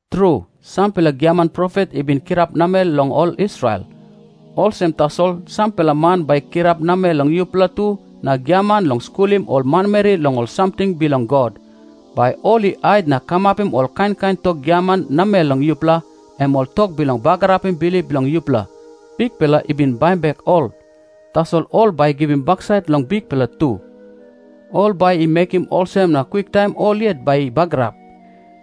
Tru, sampela giaman profet i bin kirap namel long ol Israel. Olsem tasol sampela man bai i kirap namel long yupela tu na giaman long skulim ol manmeri long ol samting bilong God. Bai ol i hait na kamapim ol kain kain tok giaman namel long yupela, em ol tok bilong bagarapim bilip bilong yupela. Bikpela i bin baim bek ol, tasol ol bai i givim baksait long Bikpela tu. Ol bai i mekim olsem na kwiktaim ol yet bai i bagarap.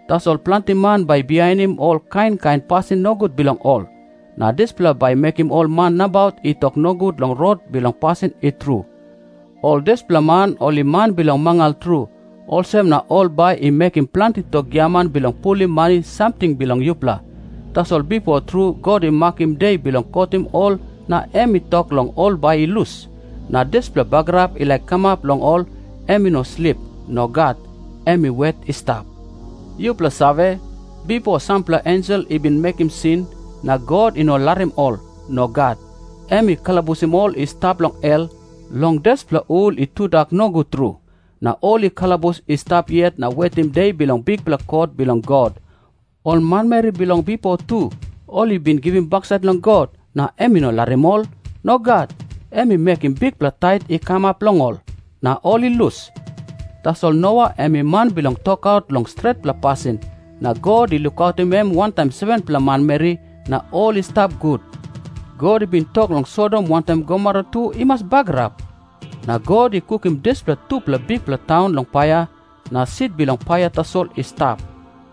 Tasol planti man bai i bihainim ol kain kain pasin nogut bilong ol. Na dispela bai i mekim ol man nabaut i tok nogut long Rot bilong pasin i tru. Ol dispela man ol i man bilong mangal tru, olsem na ol bai i mekim planti tok giaman bilong pulim mani samting bilong yupela. Tasol bipo tru God i makim de bilong kotim ol na em i tok long ol bai i lus. Na dispela bagarap i laik kamap long ol, em i no slip. Nogat. Em i wet i stap. Yupela save, bipo sampela ensel i bin mekim sin, na God i no larim ol. Nogat. Em i kalabusim ol i stap long hel, long dispela hul i tudak nogut tru. Na ol i kalabus i stap yet na wetim De bilong bikpela kot bilong God. Ol manmeri bilong bipo tu, ol i bin givim baksait long God, na em i no larim ol. Nogat. Em i mekim bikpela tait i kamap long ol, na ol i lus. Tasol Noa em i man bilong tokaut long stretpela pasin. Na God i lukautim em wantaim 7-pela manmeri, na ol i stap gut. God i bin tok long Sodom wantaim Gomora tu i mas bagarap. Na God i kukim dispela tupela bikpela taun long paia, na sit bilong paia tasol i stap.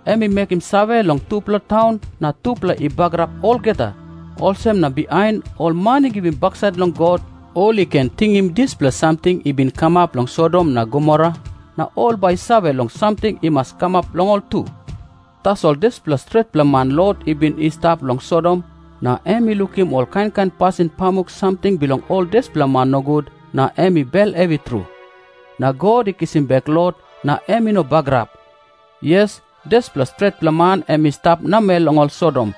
Em i mekim save long tupela taun na tupela i bagarap olgeta. Olsem na bihain, ol man i givim baksait long God, ol i ken tingim dispela samting i bin kamap long Sodom na Gomora, na ol bai i save long samting i mas kamap long ol tu. Tasol dispela stretpela man Lot i bin i stap long Sodom, na em i lukim ol kain kain pasin pamuk samting bilong ol dispela man nogut na em i bel hevi tru. Na God i kisim bek Lot, na em i no bagarap. Yes, dispela stretpela man em i stap namel long ol Sodom,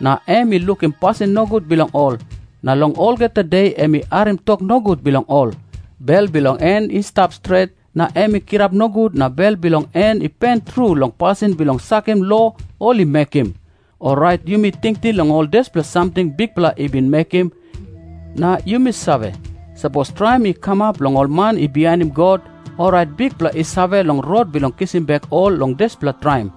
na em i lukim pasin nogut bilong ol, na long olgeta de em i harim tok nogut bilong ol. Bel bilong en i stap stret, na em i kirap nogut na bel bilong en i pen tru long pasin bilong sakim lo ol i mekim. Orait yumi tingting long ol dispela samting Bikpela i bin mekim, na yumi save, sapos traim i kamap long ol man i bihainim God, orait Bikpela i save long rot bilong kisim bek ol long dispela traim.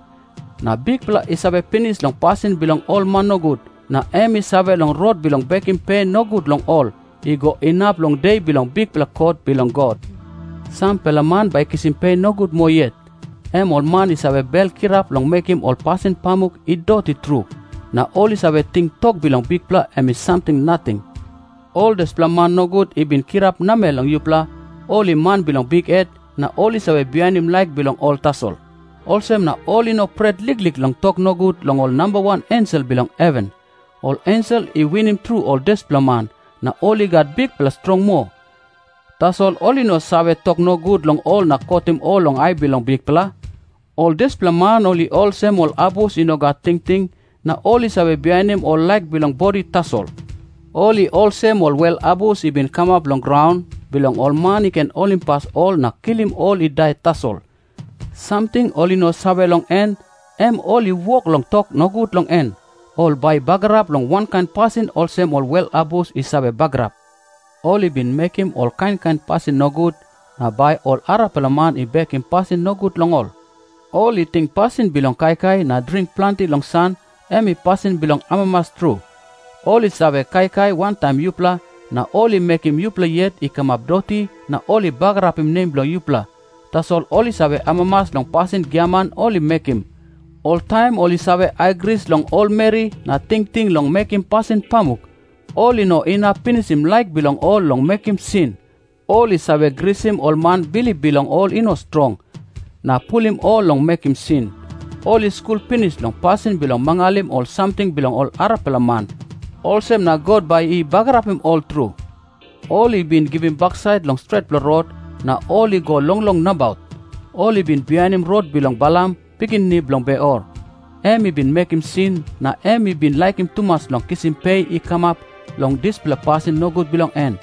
Na Bikpela i save pinis long pasin bilong ol man nogut, na em i save long rot bilong bekim pe nogut long ol, i go inap long De bilong bikpela kot bilong God. Sampela man bai i kisim pe nogut moa yet. Em ol man i save bel kirap long mekim ol pasin pamuk i doti tru, na ol i save ting tok bilong Bikpela em i samting nating. Ol dispela man nogut i bin kirap namel long yupela, ol i man bilong bikhet na ol i save bihainim laik bilong ol tasol. Olsem na ol i no pret liklik long tok nogut long ol nambawan ensel bilong heven. Ol ensel i winim tru ol dispela man, na ol i gat bikpela strong moa. Tasol ol i no save tok nogut long ol na kotim ol long ai bilong Bikpela. Ol dispela man ol i olsem ol abus i no gat tingting, na ol i save bihainim ol laik bilong bodi tasol. Ol i olsem ol wel abus i bin kamap long graun, bilong ol man i ken holimpas ol na kilim ol i dai tasol. Samting ol i no save long en, em ol i wok long tok nogut long en. Ol bai i bagarap long wankain pasin olsem ol wel abus i save bagarap. Ol i bin mekim ol kain kain pasin nogut, na bai ol arapela man i bekim pasin nogut long ol. Ol i ting pasin bilong kaikai na dring planti long san, em i pasin bilong amamas tru. Ol i save kaikai wantaim yupela, na ol i mekim yupela yet i kamap doti na ol i bagarapim nem bilong yupela. Tasol ol i save amamas long pasin giaman ol i mekim. Oltaim ol i save aigris long ol meri na tingting long mekim pasin pamuk. Ol i no inap pinisim laik bilong ol long mekim sin. Ol i save grisim ol man bilip bilong ol i no strong, na pulim ol long mekim sin. Ol i skul pinis long pasin bilong mangalim ol samting bilong ol arapela man. Olsem na God bai i bagarapim ol tru. Ol i bin givim baksait long stretpela rot, na ol i go longlong nabaut. Ol i bin bihainim rot bilong Balam, pikinini bilong Beor. Em i bin mekim sin na em i bin laikim tumas long kisim pe i kamap long dispela pasin nogut bilong en.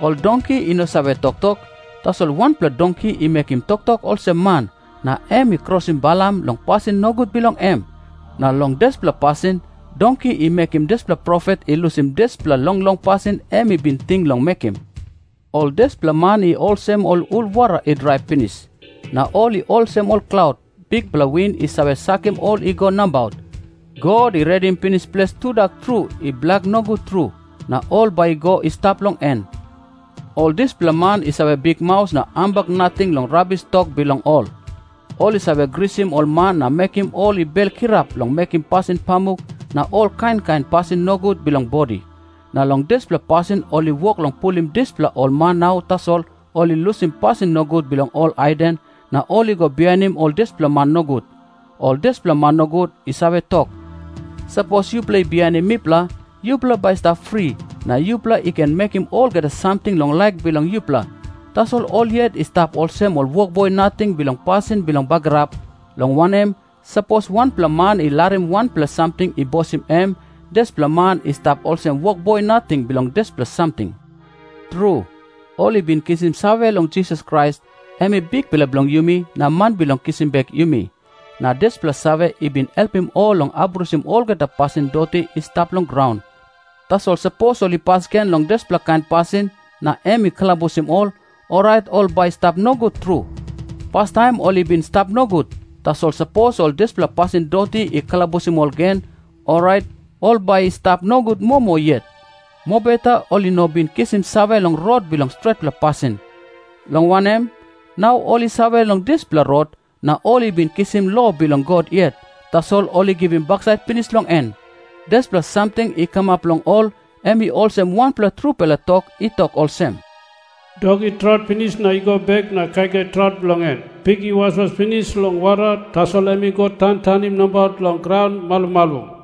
Ol donki i no save toktok, tasol wanpela donki i mekim toktok olsem man, na em i krosim Balam long pasin nogut bilong em. Na long dispela pasin, donki i mekim dispela profet i lusim dispela longlong pasin em i bin ting long mekim. Ol dispela man i olsem ol hul wara i drai pinis. Na ol i olsem ol klaut, bikpela win i save sakim ol i go nabaut. God i redim pinis ples tudak tru i blak nogut tru, na ol bai i go i stap long en. Ol dispela man i save bikmaus na hambak nating long rabis tok bilong ol. Ol i save grisim ol man na mekim ol i bel kirap long mekim pasin pamuk na ol kain kain pasin nogut bilong bodi. Na long dispela pasin ol i wok long pulim dispela ol man nau tasol ol i lusim pasin nogut bilong ol haiden, na ol i go bihainim ol dispela man nogut. Ol dispela man nogut i save tok, “Sapos yupela i bihainim mipela, yupela bai i stap fri, na yupela i ken mekim olgeta samting long laik bilong yupela.” Tasol ol yet i stap olsem ol wokboi nating bilong pasin bilong bagarap, long wanem, sapos wanpela man i larim wanpela samting i bosim em, dispela man i stap olsem wokboi nating bilong dispela samting. Tru, ol i bin kisim save long Jisas Krais, em i Bikpela bilong yumi na Man bilong kisim bek yumi. Na dispela save i bin helpim ol long abrusim olgeta pasin doti i stap long graun. Tasol sapos ol i pas gen long dispela kain pasin na em i kalabusim ol, orait ol bai i stap nogut tru. Pastaim ol i bin i stap nogut, tasol sapos ol dispela pasin doti i kalabusim ol gen, orait ol bai i stap nogut moa moa yet. Mobeta ol i no bin kisim save long Rot bilong stretpela pasin. Long wanem, nau ol i save long dispela Rot, na ol i bin kisim lo bilong God yet, tasol ol i givim baksait pinis long en. Dispela samting i kamap long ol, em i olsem wanpela trupela tok i tok olsem, “Dok i traut pinis na i go bek na kaikai traut bilong en.” Na narapela tok tu i olsem, “Pik i waswas pinis long wara, tasol em i go tantanim nabaut long graun malumalum.”